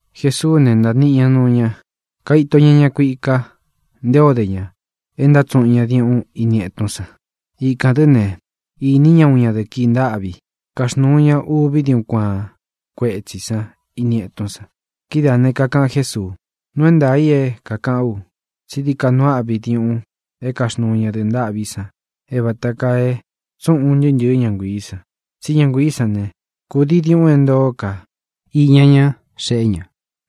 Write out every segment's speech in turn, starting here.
Jesuú ne, ntāniꞌi ña nuu ña, kaito ña ña kuika nté o de ña e ntátsuꞌun ña diuꞌun ini etún san. Ikān dɨ́ ne, īní ña uun ñadɨ̄ꞌɨ kií ntāꞌví, kaxnūu ña úvī diuꞌun kuaán kuetsī sán ini etún san. Kidáā ne, kakaꞌan Jésuu: —Nuu é ntaā i é kākaꞌán u tsi dií ka nuu áꞌvi diuꞌun é kaxnuu ñadɨ̄ꞌɨ ntâꞌví san é vāta kaa e tsúꞌun un ntɨꞌɨ ña nguiī san. Tsí ña nguiī sán ne, kūdii diuꞌun é ntoó ka iña ña xeꞌé ña,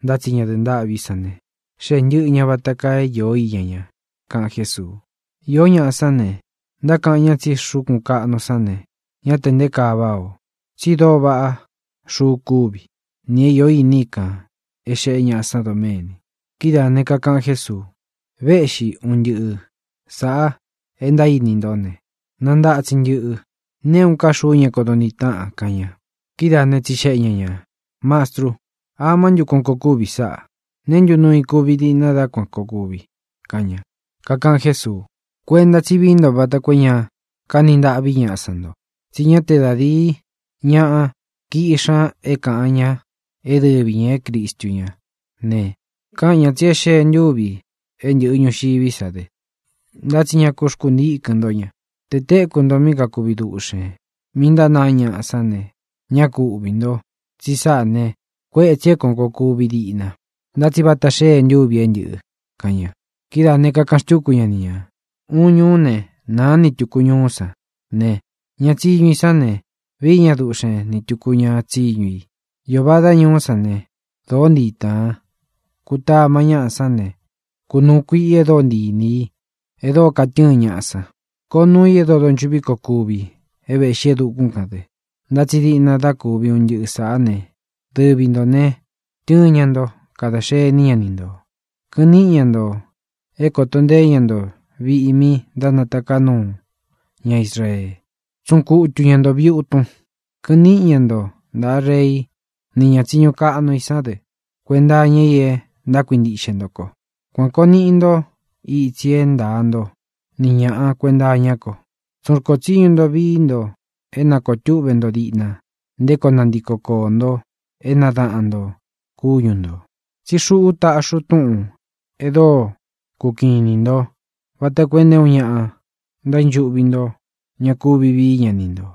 ntá tsi ñadɨ̄ꞌɨ ntâꞌví san ne, xéꞌe ntɨ̄ꞌɨ ña vata kaa é īó iña ña —kaꞌan Jésuu. Iō ñáꞌa sán ne, ntákaꞌan ña tsi xúkūn kaꞌnu sán ne, ñá tē nté kaa váꞌā o, tsi dóo vaꞌá xuu kúvi, nī é iō iní i kān é xēꞌé ñaꞌa san doméni. Kidáā ne, kakaꞌan Jésuu: —Véꞌxi ntūvi é un ntɨꞌɨ sāꞌa e ntaíní nto ne, nantatsin ntɨꞌɨ. Nté uun ká xuu ña kodo ntiꞌi táꞌan —kaꞌan ña. Kidáa ne, tsixeꞌe ña ñā: —Mastru, ¿amá ntu é kuān koo kuvi sáꞌa? ¿Neé ntu nuu i kuvi diꞌna dá kuan kōo kuvi? —kaꞌan ña. Kakaꞌan Jésuu: —Kuenta tsí vií nto vata koo é ña kaní ntaꞌví ñaꞌa san nto, tsi ñá te da dīi ñáꞌa kiꞌxi ña é kāꞌan ña é dɨvi ñā é Cristu ña ne, káꞌan ñā tsi é xee ntûvi i é ntɨꞌɨ ñūxiví sa dɨ, ntá tsi ña ku xkuntíkɨn ntó ña. Te tēkú nto mí kakuvi duꞌxēn, mí ntánāa ñáꞌa sán ne, ñá ku uꞌvī ntó, tsi sáꞌā ne, kuétsī é kuān koo kuvi diꞌna, ntá tsi vata xée ntúvi é ntɨ̄ꞌɨ —kaꞌan ña. Kidáā ne, kakaꞌan xtúku ña ni ñā: —Uun ñuú ne, nāá ni tūku ñuú san ne, ña tsiñu i sán ne, vií ña duꞌxen ni tūku ña tsiñu i. Iō vadá ñuú san ne, dōó ntii tāan; kutamá ñaꞌa sán ne, kunūu kuiꞌi e dóo ntii inī i, e dóo katɨ́ɨn ñaꞌa san. Koo nuu i e dóo donchuꞌví koo kuvi é vēꞌxí e dukún kān dɨ. ʼNtá tsi diꞌna dá kuvi un ntɨꞌɨ sāꞌá ne, dɨvi ntō ne, tɨɨn ña nto. Kada xení ña ni ntō. Kɨꞌɨn níꞌi ña ntō é kōto nteé ña nto viꞌi mí ntánataká nuu ña Israee. Tsuꞌun kutu ña nto viūtun. Kɨꞌɨn níꞌi ña nto ntāꞌa rei ni ñá tsiñu kaꞌnu i san dɨ kuenta iña i e ntákuintiꞌxe nto ko. Kuan kōo niꞌi nto itsi é ntaa nto ni ñāꞌa kuenta iñá ko. Tsun rkó tsiñu nto vií nto é ña koo túꞌvē nto diꞌna nté koo nantiko koō nto é nadaꞌan ntō kúñu ntō. Tsí xuꞌú taꞌxi u túꞌūn e dóo kukiꞌin inī ntó vata koo e nté uun ña ntaínchuꞌvi nto ña kuvi vií ña ni ntō,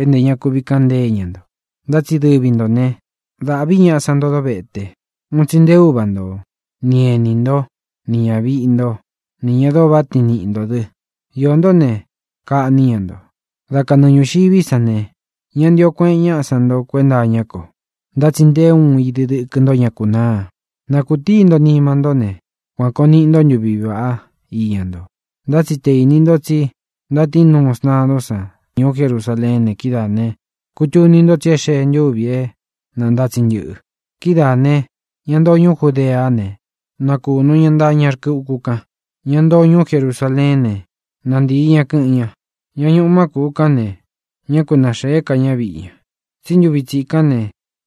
é ntē ña kuvi kaꞌan ntée ña nto. Ntá tsi dɨvi ntō ne, dáꞌvī ñaꞌa san nto dóvete, un tsi nté uva nto, ni ēní nto, nī ñaviꞌi ntó, nī ña dóo váꞌa tiin niꞌi ntō dɨ. Iō ntó ne, kaꞌní ña nto. Dá kanɨɨ ñūxiví san ne, ñá ntīo kueꞌen ñáꞌa san nto kuenta iñá ko. Ntá tsi nté uun idi dɨkɨ nto ña kunáa. Na kūtií nto nima ntó ne, kuan kōo niꞌi ntó ntuvi iña nto. ʼNtá tsi tē íni nto tsi ntántiꞌu nuu sntadún san ñuú Jerusaleén ne, kidáa ne, kūtuni nto tsi e xée ntúvi é nantatsin ntɨꞌɨ. Kidáā ne, ña ntoo ñuú Judeá ne, na kūnu ñá, ntaa ñá rkɨ uku kan. Ña ntoo ñuú Jerusaleén ne, na ntii ña, kɨ̄ꞌɨn ña. Ña ñuꞌu má kūꞌu kán ne, ñá ku naxēé ka ña viꞌi ña. Tsí ntuvi tsikán ne,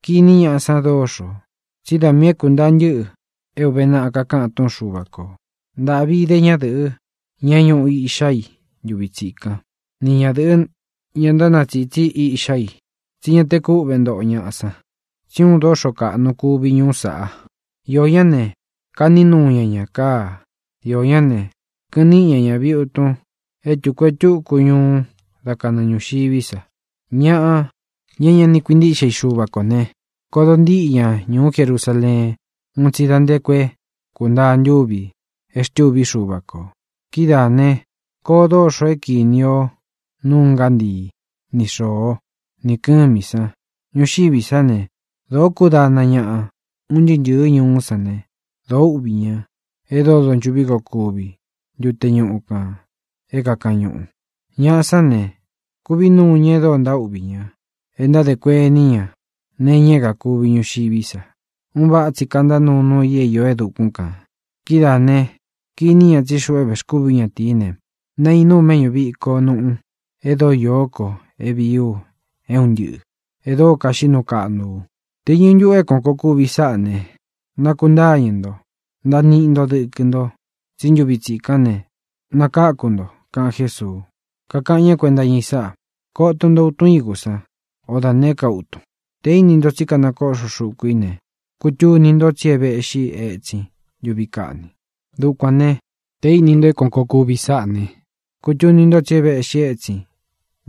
kiní ñaꞌa san dóxo, tsí da miī é kūntaa ntɨ́ꞌɨ é ūve naꞌa kakaꞌan túꞌun Xuva kō. ¡Ntāꞌvi ide ñádɨ̄ꞌɨ, ña é ñuꞌu iꞌxá i ntuvi tsikán, ni ñadɨ̄ꞌɨ, ña ntánatsītsí iꞌxá i! tsí ña te kúꞌve ntoꞌo ñaꞌa san, tsí uun doxo kaꞌnu kuvi ñuú saꞌa. Iō ñá ne, kaꞌní nuu ña ñā káa. Iō ñá ne, kɨꞌɨn níꞌi ña ña viūtun é tuku e túku ñuu dá kanɨɨ ñūxiví sa. Ñaꞌa, ña é ña ni kuintíꞌxe i Xuva kō ne, kodo ntíꞌi ña ñūú Jerusaleen un tsi da nté ku é kūntaa ntúvi e xtúvi Xúva kō. ʼKidáā ne, koo dóxo é kīni o núu ngántii, ni xōo, ni kɨ́mī san. Ñuxiví sa ne, dōo kúdana ñaꞌa un ntɨɨ́ ntɨ̄ɨ́ ñuú san ne, dōo úꞌvī ña e dóo donchūꞌví koo kuvi ntute ñuꞌu kān é kākaꞌan ñuꞌu. Ñaꞌa sán ne, kūví nuu ña e dóo ntaúꞌvī ña e ntádē kuení ña nee iña é kākuvi ñuxiví sa. Un váꞌa tsi kantá nuu nuu i é īó e dukún kān. Kidáā ne, kiní ña tsí xuꞌu é vēxkúvī ú ñatīí ne, nainú u méꞌñū viko nuꞌu e dóo iō ko é vīí u é un ntɨꞌɨ̄, e dóo kaxiꞌí nuu kaꞌnu u. Te īñɨ ntuꞌu é kuān koo kuvi sáꞌa ne, nākuntáñɨ̄ nto, ntaa niꞌi nto dɨkɨ nto, tsí ntuvi tsikán ne, nakáku nto —kaꞌan Jésuu. Kakaꞌan ñá kuenta iña i sáꞌa: —Koto nto utun ígu san, o da nēé ka utun. Tē íni nto tsí kanakōdó xuku i ne, kutuni ntó tsi é vēꞌxi étsin ntuvi kaꞌni. Dukuān né, tē íni nto é kuān koo kuvi sáꞌa ne, kutuni ntó tsi é vēꞌxi étsin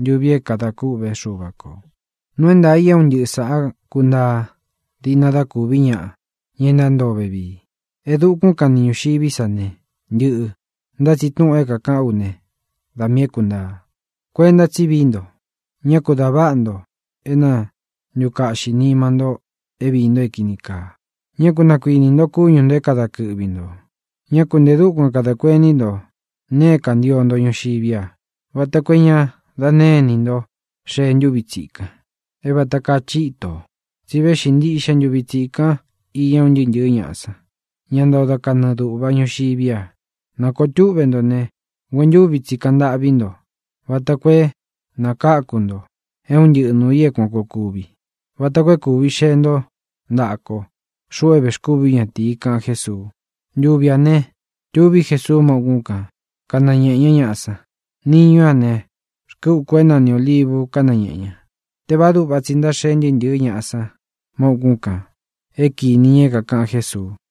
ntuvi é kadā kûꞌvé Xuva kō. ʼNuu é ntaā i é un ntɨꞌɨ sāꞌá kuntaa díꞌna dá kūví ñaꞌa, ña ntántoo vevii. E dukún kan ni ñūxiví sa ne, ntɨꞌɨ̄, ntá tsi túꞌūn é kākaꞌán u ne, da miī é kuntaa. ʼKuenta tsí vií nto. Ñá ku dā váꞌa nto é na ntūkaꞌxi nima ntó é viī nto é kīni kaa. Ñá ku nakuinī nto kúñu ntō é kada kɨꞌvi ntō. Ñá ku ntē dúkuan kadā kuení nto nee é kantio nto ñuxiví a, vata koo é ña da née inī nto xee ntúvi tsikan, é vata kaa chitō. Tsi véꞌxi ntiꞌxe ntuvi tsīkan iña un ntɨɨ́ ntɨ̄ɨ́ ñaꞌa san, ña ntoo da kanɨɨ dūꞌva ñuxiví a. Na kōo túꞌvē ntó ne, nguentúvi tsi kaꞌan ntâꞌví nto vata koo é nakáku nto é un ntɨꞌɨ nūu i é kuān koo kuvi, vata koo é kūvi xee ntó ntaꞌa ko, xuꞌu é vēxkúvī ú ñatīi —kaꞌan Jésuu. Ntuvi ā ne, tuví Jesuu má ukún kan, kanañēꞌe ñá ñaꞌa san. Niñú a ne, rkɨ uku é nani Ōlivu kañéꞌe ña. Tévāá duꞌva tsi ntáxee ntɨɨ́ ntɨ̄ɨ́ ñaꞌa san má ukún kān é kīni ña é kākaꞌan Jésuu.